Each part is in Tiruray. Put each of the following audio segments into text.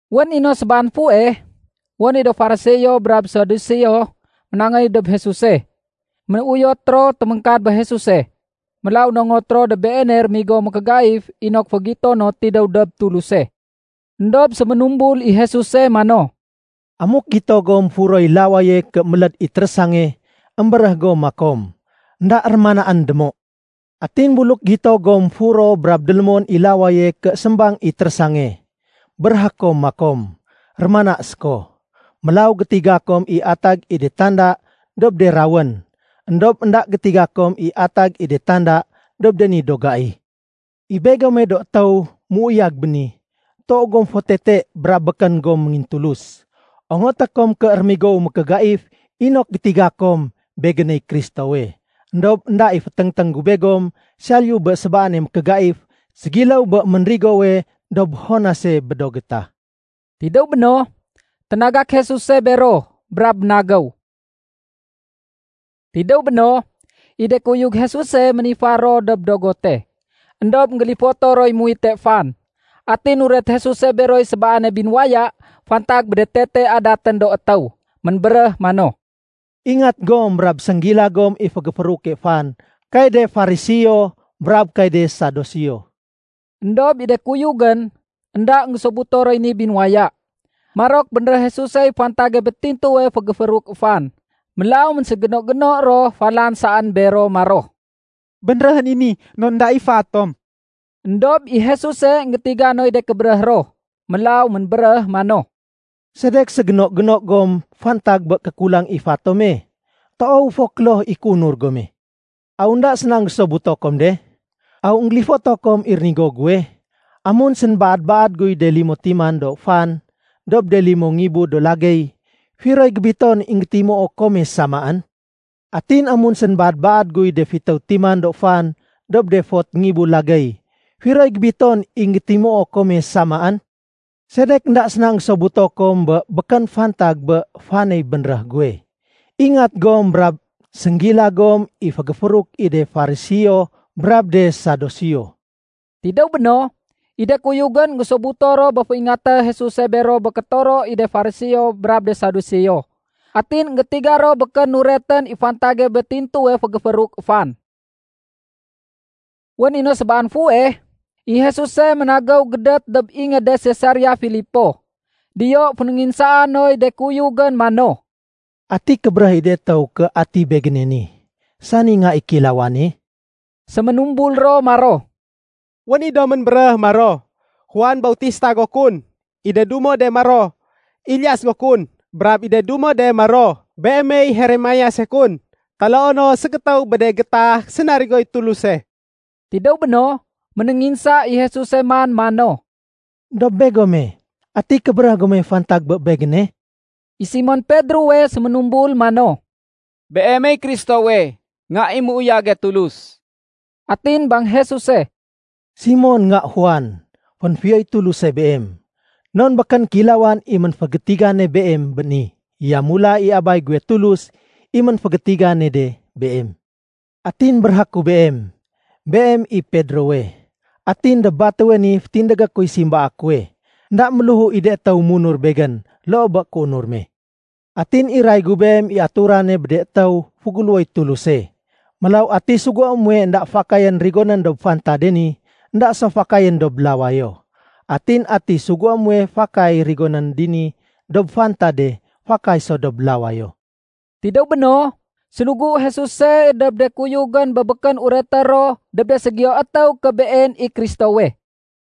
Wén i no sébaan fuweh, wén i do Fariseo brab do Saduseo ménangéy dob Jesuse. Ménuyot ro téméngkad bé Jesuse. Mélaw nongot ro dob Beene rémigo mékégaif inok fégito no tidéw dob Tuluse. Endob séménumbul i Jesuse mano, “Amuk gito gom furoy lawaye ké méléd i térésange, émbéréh gom makom, ‘Enda rémanaén démo.’ Atin buluk gito gom furo brab délémon i lawaye ké sémbang i térésange, béréhé kom makom, ‘Rémana séko.’ Mélaw gétiga kom i atag i de tanda dob de rawén. Endob énda gétiga kom i atag i de tanda dob de ni do gai. I begome do étéw méuyag béni, toow gom fo tete brab békén gom méngintulus. Ongoté kom ké rémigowu mékégaif inok gétiga kom Begéney Kristowe. Endob énda i féténgténg gu begom saliyu bé sébaane mékégaif ségiléw bé ménrigowe dob Jonase bé do gétah.” Tidéw béno, ténagak Jesuse bero brab ménagéw. Tidéw béno, i de kuyug Jesuse ménifar ro dob dogote. Endob énggélifoto roy muwite fan. Atin nuret Jesuse beroy sébaane binuwaya fantag bé de tete adatén do étéw. Ménbéréh mano, “Ingat gom brab sénggila gom i fégéfééruke fan kay de Fariseo brab kay de Saduseo.” Endob i de kuyugén, énda énggésobuto roy ni binuwaya. Marok bénréh Jesusey fantage bé tintuwe fégéfééruk fan. Mélaw ménségéno-géno ro falan saén bero maro, “Bénréhén i ni non énda i fa tom.” Endob i Jesuse énggétiga noy de kébéréh ro. Mélaw ménbéréh mano, “Sedek ségéno-géno gom fantag bé kékulang i fa tome? Toow fo kloh i kéunur gome. Aw énda séna énggésobuto kom de? Aw énggélifoto kom i rénigo guwe? Amun sénbaad-baad guy de limo timan do fan dob de limo ngibu do lagéy, firoy gébiton i énggétimuo kome samaén? Atin amun sénbaad-baad guy de fitéw timan do fan dob de fot ngibu lagéy, firoy gébiton i énggétimuo kome samaén? Sedek énda séna énggésobuto kom i békén fantag bé faney bénréh guwe? Ingat gom brab sénggila gom i fégéfééruk i de Fariseo brab de Saduseo.” Tidéw béno, i de kuyugén énggésobuto ro bé féingaté Jesuse bero bé kétoro i de Fariseo brab de Saduseo. Atin énggétiga ro békén nuretén i fantage bé tintuwe fégéfééruk fan. Wén i no sébaan fuweh, i Jesuse ménagéw gédét dob ingéde Sesarea Filipo. Diyo fénénginsaa noy de kuyugén mano, “Ati kébéréh i de étéw ké ati Begéne ni, sani Nga i Kéilawane?” Séménumbul ro maro, “Wén i do ménbéréh maro, Juan Bautista go kun. I de dumo de maro, Elias go kun. Brab i de dumo de maro, Beemey Jeremiase kun, taloo no ségétéw bé de gétah sénarigoy Tuluse.” Tidéw béno, ménénginsa i Jesuse man mano, “Dob begome, ati kébéréh gome fantag bé Begéne?” I Simon Pedrowe séménumbul mano, “Beemey Kristowe, Nga i méuyage Tulus.” Atin bang Jesuse, “Simon, nga Juan, fénfiyoy Tuluse beem. Non békén kéilawan i ménfégétigane beem bé ni. Yamula i Abay guwe Tulus i ménfégétigane de beem. Atin béréhé ku beem, beem i Pedrowe, atin dob batéwe ni fétindégé kuy simbaa kuwe. Enda méléhu i de étéw munur Begén loo bé kéunur me. Atin iray gu beem i aturane bé de étéw féguléwoy Tuluse. Mélaw ati sugué muwe énda fakayén rigonén dob fantade ni, énda so fakayén dob lawayo. Atin ati sugué muwe fakay rigonén dini dob fantade, fakay so dob lawayo.” Tidéw béno, sénugu Jesuse dob de kuyugén bé békén ureté ro dob de ségiyo étéw ké Been i Kristowe.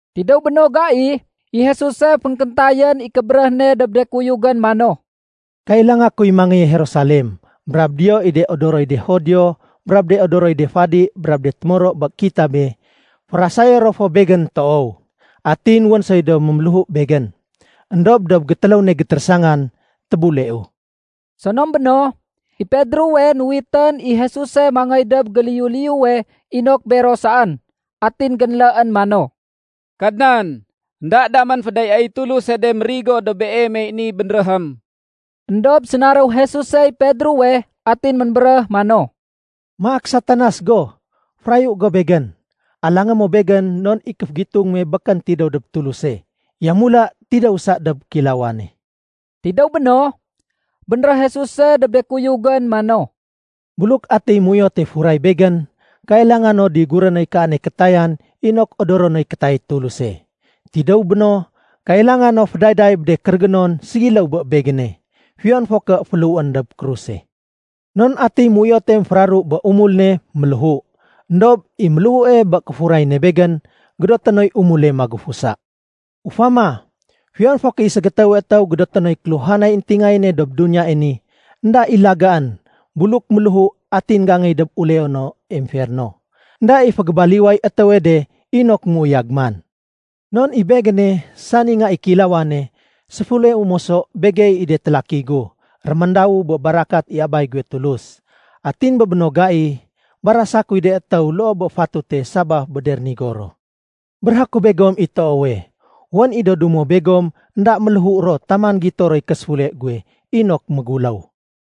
Tidéw bé no gai, i Jesuse fénkéntayén i kébéréh ne dob de kuyugén mano, “Kailanga kuy mangéye Jerusalem brab diyo i de odoroy de Judio brab de odoroy de fadi brab de témoro bé kitabé, férasayé ro fo Begén toow. Atin wén soy do méméléhu Begén. Endob dob gétéléw ne gétérésangan, tébuleu.” Sonom béno, i Pedrowe nuwitén i Jesuse mangéy dob géliyu-liyuwe inok bero saén, atin génléén mano, “Kadnan, énda damén fédayaéy Tuluse de mérigo dob Beemey ni bénréhém.” Endob sénaréw Jesusey Pedrowe atin ménbéréh mano, “Maak Satanas go! Férayu go Begén. Alangé mo Begén non i kéfégitung me békén tidéw dob Tuluse, yamula tidéw sa dob kéilawane.” Tidéw béno, bénréh Jesuse dob de kuyugén mano, “Buluk atiy méuyote furay Begén, kailanga no diguré noy kaane kétayan inok odoro noy kétayay Tuluse. Tidéw béno, kailanga no fédayday bé de kérégénon ségiléw bé Begéne, fiyon fo ké féléhuén dob kruse. Non atiy méuyote émféraru bé umul ne, méléhu. Endob i méléhue bé kéfuray ne Begén, gédoté noy umule magufusa. Ufama, fiyon fo ké i ségétéwe étéw gédoté noy kéluhanay éntingayéne dob duniyae ni, énda i lagaén buluk méléhu atin géangéy dob uleono emferno. Enda i fégébaliway étéwe de inok méuyag man. Non i Begéne, sani Nga i Kéilawane, séfuleu moso begey i de télaki gu, réméndawu bé barakat i Abay guwe Tulus. Atin bé béno gai, barasa kuy de étéw loo bé fatute sabaf bé de rénigo ro. Béréhé ku begom i toowe, wén i do dumo begom énda méléhu ro taman gito roy késéfule guwe inok méguléw.”